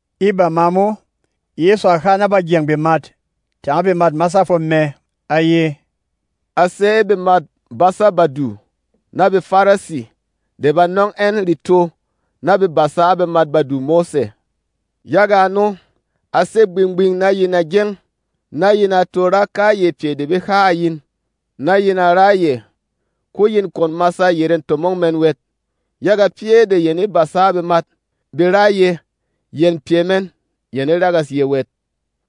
E bama mo, Yɛsu a ha na bagyɛng bemat tanga bemât masâ fwom mɛ, a ye, “A sé e bemât basâ Badu na BeFarisi de ba nɔng ɛn reto na be basa a bemat Badu Mose. Yaga ano, a sé gbing-gbing na yin a gyeng, na yin a to ra kayɛ pyɛ de be ha a yin, na yin a ra yɛ. Ko yin kwon masa yerê tomong mɛn wɛt, yaga pyɛ́ de yɛn e basa a bemat, be ra yɛ̄, yɛn pyɛ mɛn yɛn e ragas yɛ̄ wɛt.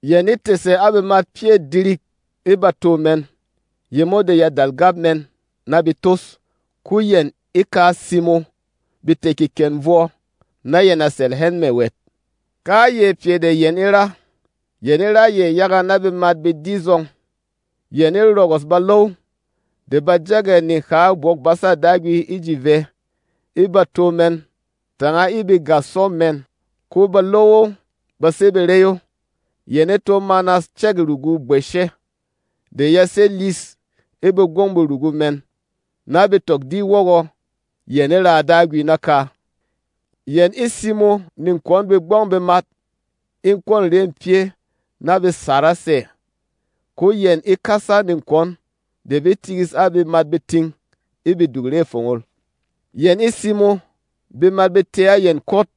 Yɛn e tɛ̀sɛ a bemat pyɛ́ dirik e bato mɛn yemo de ya dal gap mɛn na be tos, ko yɛn e ka simo be tɛ̀ kekɛn vwɔ na yɛn a sɛlɛ hɛn mɛ̀ wɛt. Kayɛ pyɛ de yɛn e ra, yɛn e ra yɛ yaga na bemat be di zɔng: Yɛn e rɔgɔs balow de ba jɛk ɛ̀ neha Bwok-basa Dagwi e ji vɛ e bato mɛn tanga e bègasɔ mɛn, ko balow o ba sé barey o. Yɛn e to manas cɛ̂k rugû bwɛshɛ de ya sé lyis e begbɔng berugu mɛn na be tɔk di wɔgɔ, yɛn e raa Dagwi naka. Yɛn e simo nekwɔn begbɔng bemat e kwɔ̂n rê pyɛ́ na be saras ɛ̀, ko yɛn e kasa nekwɔn de be tikis a bemat beting e beduk re fongol; yɛn e simo bemat be tē a yɛn kwot,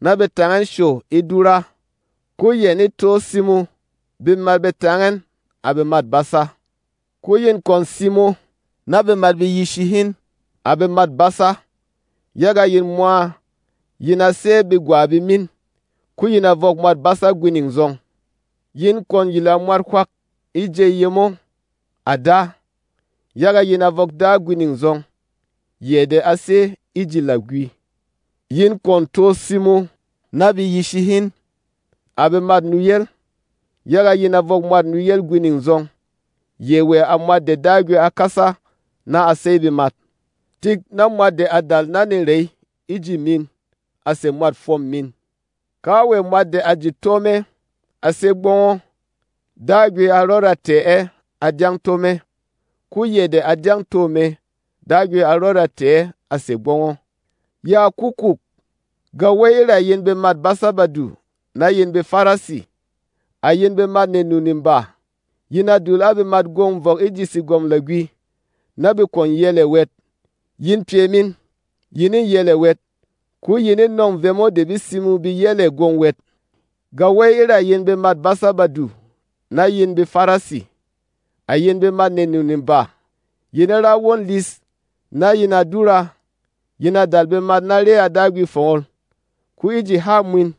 na be tang ɛn show e dúra, ko yɛn e to simo bemat be tang ɛn, à bemât basa. “Ko yin kwon simo na bemat be yishi hin, à bemât basa, yaga yin mwa yin a sé begwa bemin, ko yin a vɔk Mwat Basa gwining zɔng. Yin kwon yila mwat hwak e jey yemo, à da, yaga yin a vɔk Da gwining zɔng, yɛ de a sé e ji lagwi. Yin kwon to simo na be yishi hin, à bemât nuyel, yaga yin a vɔk Mwat Nuyel gwining zɔng, yɛ wɛ à Mwat de Dagwi a kasa na a sey bemat. Tik na mwat de a dal na nerey e ji min a sè mwât fwom min. Kawɛ mwat de a jut tó mɛ, a sé gbɔng o, Dagwi a rɔda tɛ̀ ɛ a dyɛng to mɛ, ko yɛ de a dyɛng to mɛ, Dagwi a rɔda tɛ̀ ɛ a sè gbɔng o. “Yaa kukuuk! Gawey e ra yin bemât basâ Badu na yin BeFarisi! À yin bemât nenu-neba! Yin a dul a bemat gwong vɔk e ji Segwɔm Lagwi na be kwon yel ɛ̀ wɛt. Yin pyɛ min yin e yel ɛ̀ wɛt, ko yin e nɔ̂ng vemo de be simo be yel ɛ̀ gwong wɛt. [ “Gawey e ra yin bemât basâ Badu na yin BeFarisi! À yin bemât nenu-neba! Yin e ra won lis na yin a dura, yin a dal bemat na re a Dagwi fongol, ko e ji hâ mwin,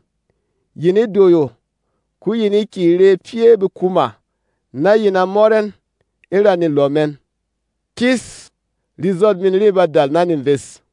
yin e doyo, ko yin e kyě re pyɛ̂ bekuma na yin a mɔt ɛn e ra nelɔ mɛn. Kis! Rezot min re ba dal na neves!]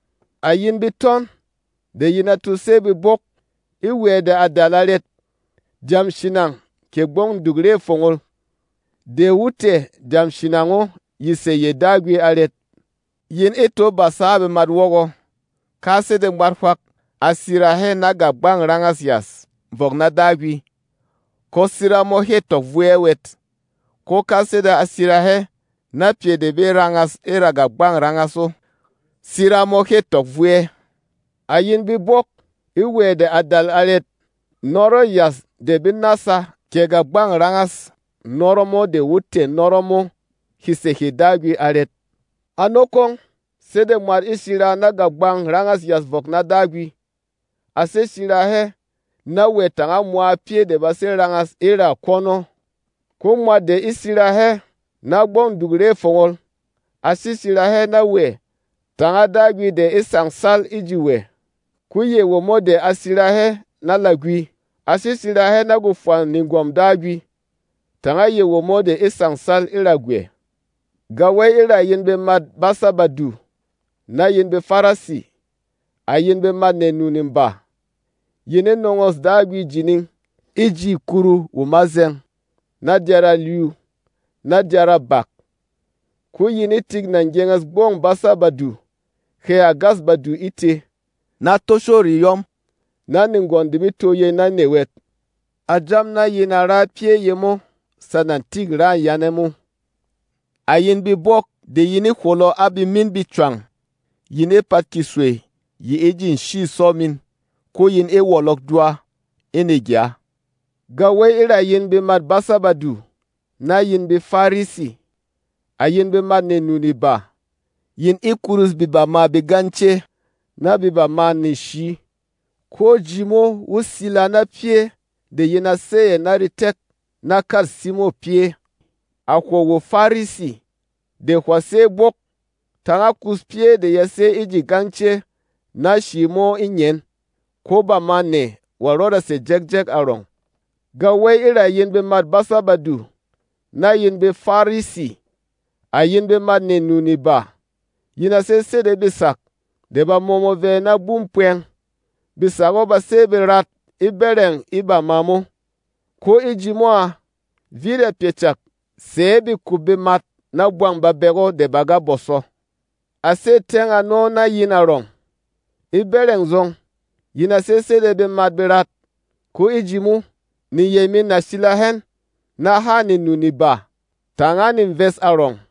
À yin betɔn de yin a to sé bebók! E wɛ̌ de a dal arɛt? Dyam shinang kɛ Gbɔng Duk Re Fongol de wo tɛ̀ dyam shinang o ye sè ye Dagwi arɛt? Yin e to basa a bemat wɔgɔ, ‘Ka sede mwat hwak a sira hɛ na gàgbang rangâs yas vɔk na Dagwi, ko sira mo hê tɔk vo ɛ wɛt; ko ka sede a sira hɛ na pyɛ de be rangas e ra gàgbang rangas o, sira mo hê tɔk vo ɛ.’ À yin bebók! E wɛ̌ de a dal arɛt? Nɔrɔ̂ yas de be nása kɛ gàgbang rangâs nɔrɔ mo de wo tɛ̀ nɔrɔ mo he sè hê Dagwi arɛt? Ano kwong, sede mwat e sira na gàgbang rangâs yas vɔk na Dagwi, a sé sira hɛ na wɛ tanga mwa pyɛ́ de ba sé rangas e ra kwɔn o. Ko mwat de e sira hɛ na Gbɔng Duk Re Fongol a sé sira hɛ na wɛ tanga Dagwi de e sangsal e ji wɛ. Ko yɛ womo de a sira hɛ na lagwi a sé sira hɛ na gwofwa negwɔm Dagwi tanga yɛ womo de e sangsal e ra gwɛ. “Gawey e ra yin bemât basâ Badu na yin BeFarisi! À yin bemât nenu-neba! Yin e nɔngɔ̂s Dagwi jining e ji kuru wo mazɛng, na dyara-lyu, na dyarâ-bak, ko yin e tik nà gyenges gbɔng basâ Badu, hɛ à gas badu e tē, na toshô reyɔm, na negwɔn de be tó yey na nɛ wɛt. A jam na yin a ra pyɛ́ yemo sana tik râ yane mo. À yin bebók de yin e hwɔlɔ a bemin becwang! Yin e pat keswey yi e ji nshî sɔ min, ko yin e wɔlɔk dwa e negya. “Gawey e ra yin bemât basâ Badu na yin BeFarisi! À yin bemât nenu-neba! Yin e kurus bebamâ begance na bebamâ neshǐ, ko ji mo wo sila na pyɛ́ de yin a sey ɛ̀ na retek na kât simô pyɛ́. À hwo WoFarisi de hwà sé bwók! Tānga kus pyɛ́ de ya sé e ji gance na shǐ mo e ngyen, ko bamâ nɛ wa rɔda sè jɛkjɛk arɔng! “Gawey e ra yin bemât basâ Badu na yin BeFarisi! À yin bemât nenu-neba! Yin a sé sede besak de ba mɔmɔ vɛ na būm pwɛng. Besak o ba sé berat e bɛrɛng e bama mo, ko e ji mo à, vit a pyɛ cak sɛ̌ bekup bemat na bwang babek o de ba ga bɔsɔ. A sé tyɛng ano na yin arɔng: E bɛ́rɛng zɔng, yin a sé sede bemat berat, ko e ji mo, neyey min na sila hɛn na hâ nenu-neba tanga neves arɔng.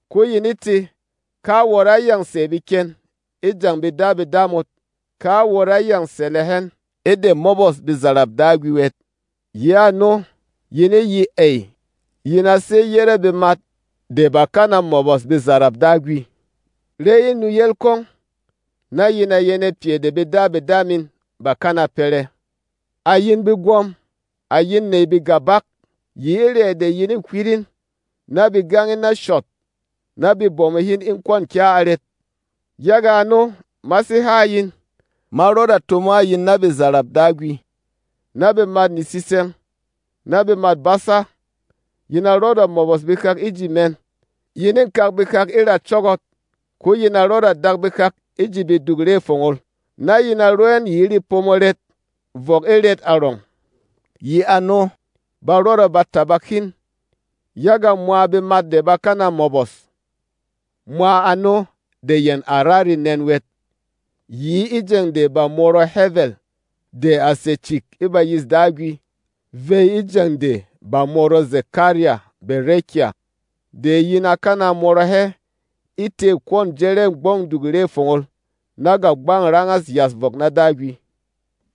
Ko yin e tē, ‘Ka wot á yâng sè beken e jeng bedabeda mot, ka wot á yâng sɛlɛ hɛn e de mɔbɔs bezarap Dagwi wɛt.’ Yi ano, yin e ye ey, yin a sé yére bemat de bà kana mɔbɔs bezarap Dagwi. Ré in nuyel kwong, na yin a yɛnɛ pyɛ de bedabeda min bà kana pɛrɛ! À yin begwɔ̄m! À yin nèy bègàbak! Yi e rɛ̌ de yin ê hywit in na be gang in na shɔt, na be bomo hin e kwɔ̂n kya arɛt? Yaga ano, ma sé ha a yin, ma rɔda tomo a yin na bezarap Dagwi, na bemât netsitsɛng, na bemât basa. Yin a rɔda mɔbɔs behak e ji mɛn, yin ê kak behak e ra cɔ́gɔt, ko yin a rɔda dak behak e ji beduk re fongol, na yin a ro ɛn yi e repomo ret vɔk e ret arɔng. Yi ano, ba rɔda ba tabak hin yaga mwa bemat de bà kana mɔbɔs, mwa ano de yɛn à ra renɛn wɛt, yi e jeng de bà mɔrɔ Hɛvɛl de à sè cik e bayîs Dagwi vey e jeng de bà mɔrɔ Zɛkarya Bɛrɛkya, de yin á kana mɔrɔ hɛ e tê kwɔ̂n jɛrɛ̂ Gbɔng Duk Re Fongol na gàgbang rangâs yas vɔk na Dagwi.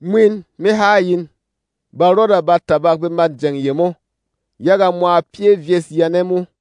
Mwin me ha a yin: Ba rɔda ba tabak bemât jeng yemo yaga mwa pyɛ́ vyes yane mo.”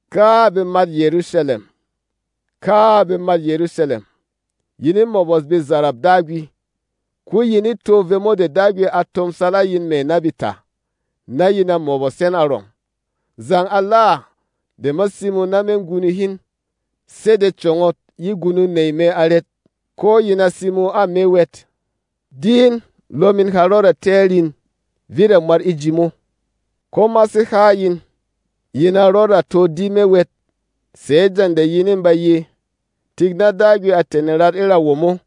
“Káa! À bemât Yɛrusalɛm! Káa! À bemât Yɛrusalɛm! Yin e mɔbɔs bezarap Dagwi, ko yin e tó vemo de Dagwi a tomsal a yin mɛ̀ na beta, na yin a mɔbɔs hɛn arɔng! Zang ala de ma simo na me gunung hin sede congot ye gunung nèy mɛ arɛt? Ko yin a simo a me wɛt. Di in, lɔ min ha rɔda tɛ́ ɛ rin, vit a mwat e ji mo. Ko ma sé ha a yin, yin a rɔda to di me wɛt sɛ̌ jeng de yin e ba ye, ‘Tik na Dagwi a tɛ̀ nerat e ra womo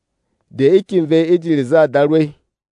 de e kyè vey e ji rezâ Darwey.’”